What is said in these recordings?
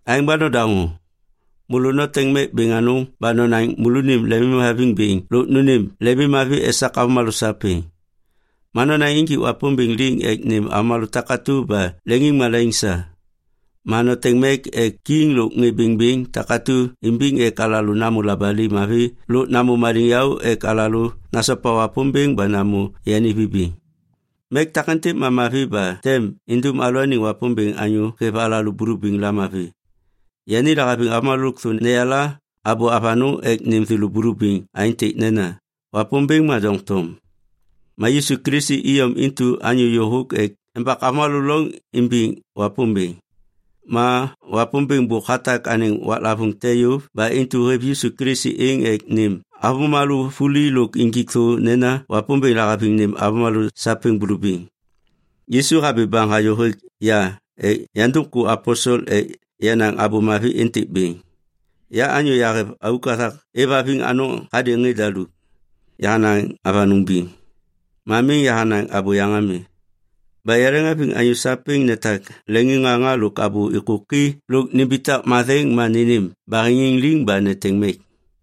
Aêŋ ba nodaŋô! Môlô noteŋ mek bêŋ anôŋ ba nonaŋ môlônim lemimhaviŋ bêŋ lôk nônêm lemimmavi esak avômalô sapêŋ. Ma nonaŋ injik Wapômbêŋ liŋ ek nêm avômalô takatu ba leŋiŋmalaiŋ sa. Ma noteŋ mek ek kiŋ lôk ŋê bêŋbêŋ takatu imbiŋ ek alalô namô labali mavi lôk namô maliŋyaô ek alalô nasopa Wapômbêŋ ba namô yani vibiŋ. Mek takêntêk ma mavi ba tem indum alalôaniŋ Wapômbêŋ anyô hêv alalô bulubiŋ lamavi. Yani lahaviŋ avômalô lôkthô neyala abô avanôŋ ek nêm thêlô bulubiŋ aêntêk nena Wapômbêŋ ma doŋtom. Ma Yisu Kilisi iyom intu anyô yôhôk ek embak avômalô loŋ imbiŋ Wapômbêŋ. Ma Wapômbêŋ bôk hatak anêŋ waklavôŋ te yôv ba intu hêv Yisu Kilisi êŋ ek nêm avômalô vuli lôk injik thô nena Wapômbêŋ lahaviŋ nêm avômalô sapêŋ bulubiŋ. Yisu habi baŋ hayô hêk ya ek yandum ku aposel ek yanaŋ abô mavi êntêk bêŋ. Ya anyô yahêv auk hathak êvhaviŋ anôŋ hadêŋ ŋê daluk. Yahanaŋ avanôŋ biŋ. Ma miŋ yahanaŋ abôyaŋ ami. Ba yaleŋhaviŋ anyô sapêŋ netak leŋiŋŋaŋa lôk abô êkôki lôk nimbitak matheŋ ma nênêm baheŋiŋ liŋ ba neteŋ mek.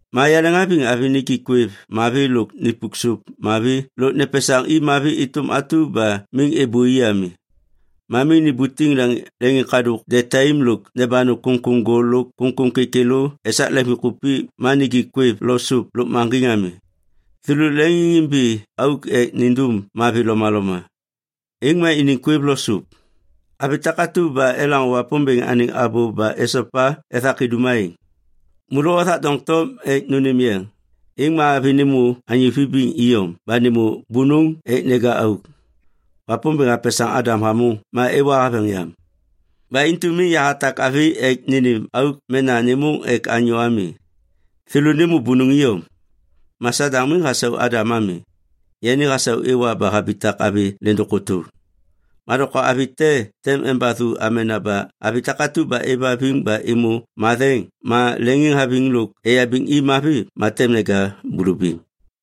Ma yaleŋhaviŋ avi nijik kwêv mavi lôk nipuk sôp mavi lôk nepesaŋ i mavi êtôm atu ba miŋ êbôi ami. Ma miŋ nibutiŋ leŋiŋkadôk detaim lôk nebanu kômkôm gol lôk kômkôm kêkêlô esak leŋviŋkupik ma nijik kwêv lo sôp lôkmaŋgiŋ ami. Thêlô leŋiŋimbi auk ek nindum mavi lomaloma. Êŋ ma iniŋ kwêv lo sôp. Avi takatu ba elaŋô Wapômbêŋ anêŋ abô ba esopa ethak idum aêŋ. Môlô othak doŋtom ek nônêm yeŋ, êŋ ma avi nêmô anyô vibiŋ iyom ba nêmô bônôŋ ek neja auk. Wapômbêŋ hapesaŋ Adam hamôŋ ma Ewa haveŋ yam. Ba intu miŋ yahatak avi ek nênêm auk mena nêmôŋ ek anyô ami. Thêlô nêmô bônôŋ iyom. Ma Sadaŋ miŋ hasau Adam ami. Yani hasau Ewa ba habitak avi lêndôŋ kôtôŋ. Ma doŋtom avi te tem embathu amena ba avi takatu ba êvhaviŋ ba êmô matheŋ ma leŋiŋhaviŋ lôk eyabiŋ i mavi ma tem neja bulubiŋ.